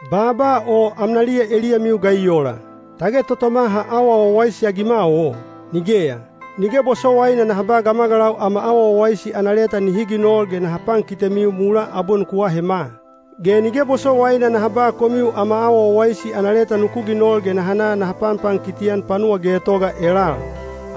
Baaba o amnaliya eliyamiu ga i ola? Tage totoma ha awa wawaisi-agima o? Nigeya! Nige bosowaina naha ba gamagalau ama awa wawaisi ana leta nihi ginol ge naha pankitemiu mulaa abwe nuku ahema. Ge nige bosowaina naha ba komiu ama awa wawaisi ana leta nuku ginol ge naha na naha panpankiti-an panuwa getoga elal.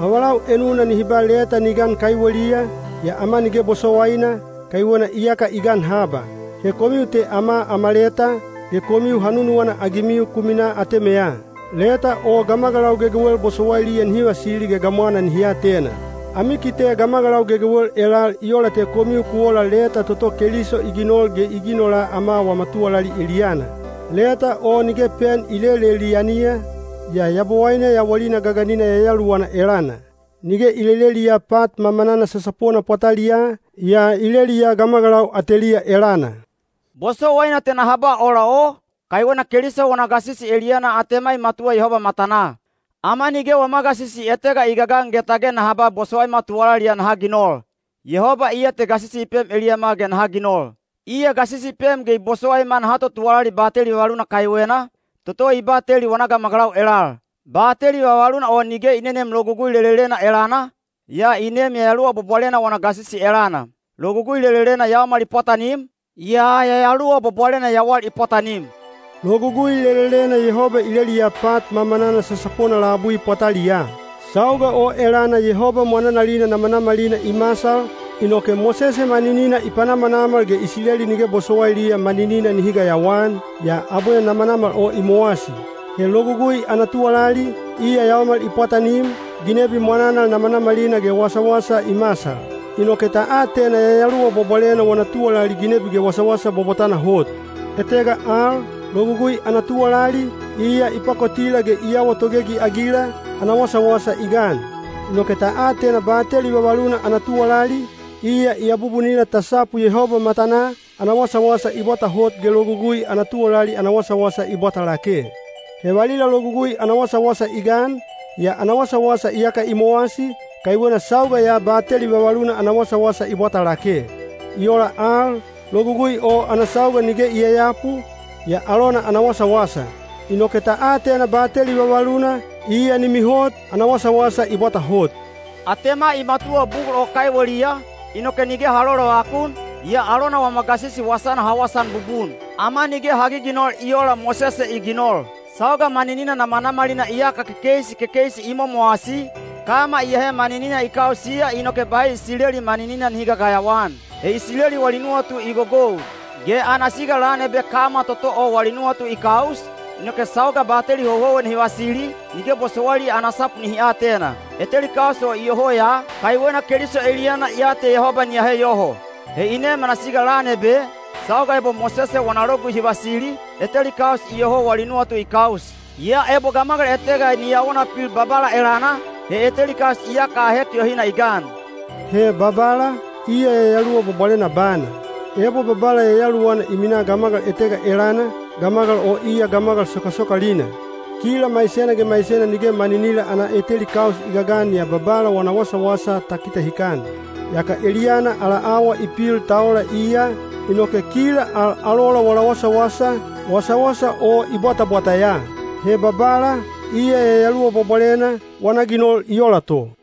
Avalau enuna nihi ba leta ni gan kaiweliya, yaa ama nige bosowaina, kaiwena iyaka i gan haba. He komiu te ama ama leta, ge komiu ha nunuwana-agimiu ku minaa atemeya. Leta o gamagalau gegewel bosowailiya nihi vasili ge gamwana nihi atena. Ami kite gamagalau gegewel elal i ola te komiu ku ola leta toto Keliso i ginol ge i ginola ama wama tuwalali eliyana. Leta o nige pen i lelelianiya, yaa Yabowaine yawalina gaganina Yayaluwana elana. Nige i leleliya pat mamanana sasapona pwataliyaa, yaa i leliya gamagalau ateliya elana. Bosowaina te naha ba ola o, kaiwena Keliso wana gasisi eliyana atema i matuwa Yehoba matanaa. Ama nige wama gasisi etega i gagan ge tage naha ba bosowaima tuwalali ya naha ginol. Yehoba iya te gasisi i pem eliyama ge naha ginol. Iya gasisi i pem ge bosowaima naha totuwalali bateli vavaluna kaiwena, toto i bateli wana gamagalau elal. Bateli vavaluna o nige i neneem Logugui lelelena elana, yaa i neem Yayaluwa Bwabwalena wana gasisi elana. Logugui lelelena yaomal i pwatanim, yaa Yayaluwa Bwabwalena yawal i pwatanim. Logugui lelelena Yehoba i leliya pat mamanana sasapona labui pwataliyaa. Sauga o elana Yehoba mwananalina namanamalina i masal, inoke Mosese maninina i panamanamal ge Isileli nige bosowailiya maninina nihi gayawaan, yaa abwe namanamal o i mowasi. He Logugui ana tuwalali, iya yaomal i pwatanim, ginebi mwananal namanamalina ge wasawasa i masal. Inoke ta atena Yayaluwa Bwabwalena wana tuwalali ginebi ge wasawasa bwabwatana hot. Etega al, Logugui ana tuwalali, iya i pakotila ge i awa togegi-agila, ana wasawasa i gan. Inoke ta atena bateli vavaluna ana tuwalali, iya i abubunila ta sapu Yehoba matanaa, ana wasawasa i bwata hot ge Logugui ana tuwalali ana wasawasa i bwata lake. He valila Logugui ana wasawasa i gan, yaa ana wasawasa iyaka i mowasi, kaiwena sauga ya bateli vavaluna ana wasawasa i bwata lake. I ola al, Logugui o ana sauga nige i yayapu, yaa alona ana wasawasa. Inoke ta atena bateli vavaluna, iya ni mihot, ana wasawasa i bwata hot. Atema i matuwa bugul bolo o kaiweliya, inoke nige ha lolovakun, yaa alona wama gasisi wasana ha wasaan bubun. Ama nige ha giginol i oola Mosese i ginol. Sauga maninina namanamalina iyaka kekeisi kekeisi i momowasi, kama i ahe maninina i kausiya inoke bahi Isileli maninina nihi gagayawa-an. He Isileli wali nuwatu i gogou. Ge ana siga lan ebe kama toto o wali nuwatu i kaus, inoke sauga bateli houhouwena hi vasili, nige bosowailiya ana sapu nihi atena. Eteli kaus o iyoho ya, kaiwena Keliso eliyana ya te Yehoba ni ahe yoho. He i nem ana siga lan ebe, sauga ebo Mosese wana Logugui hi vasili, eteli kaus iyoho wali nuwatu i kaus. Yaa ebo gamagal etega ni awona pil Babala elana, he eteli kaus iyaka ahek yohina i gan. He “Babala,” iya Yayaluwa Bwabwalena bana. Ebo Babala Yayaluwana i minaa gamagal etega elana, gamagal o iya gamagal sokasokalina. Kila maisena ge maisena nige maninila ana eteli kaus i gagan yaa Babala wana wasawasa ta kitahikan. Yaka eliyana ala awa i pil ta ola iya, inoke kila al alola wala wasawasa, wasawasa o i bwatabwata ya. He Babala, iya Yayaluwa Bwabwalena, wana ginol i ola to.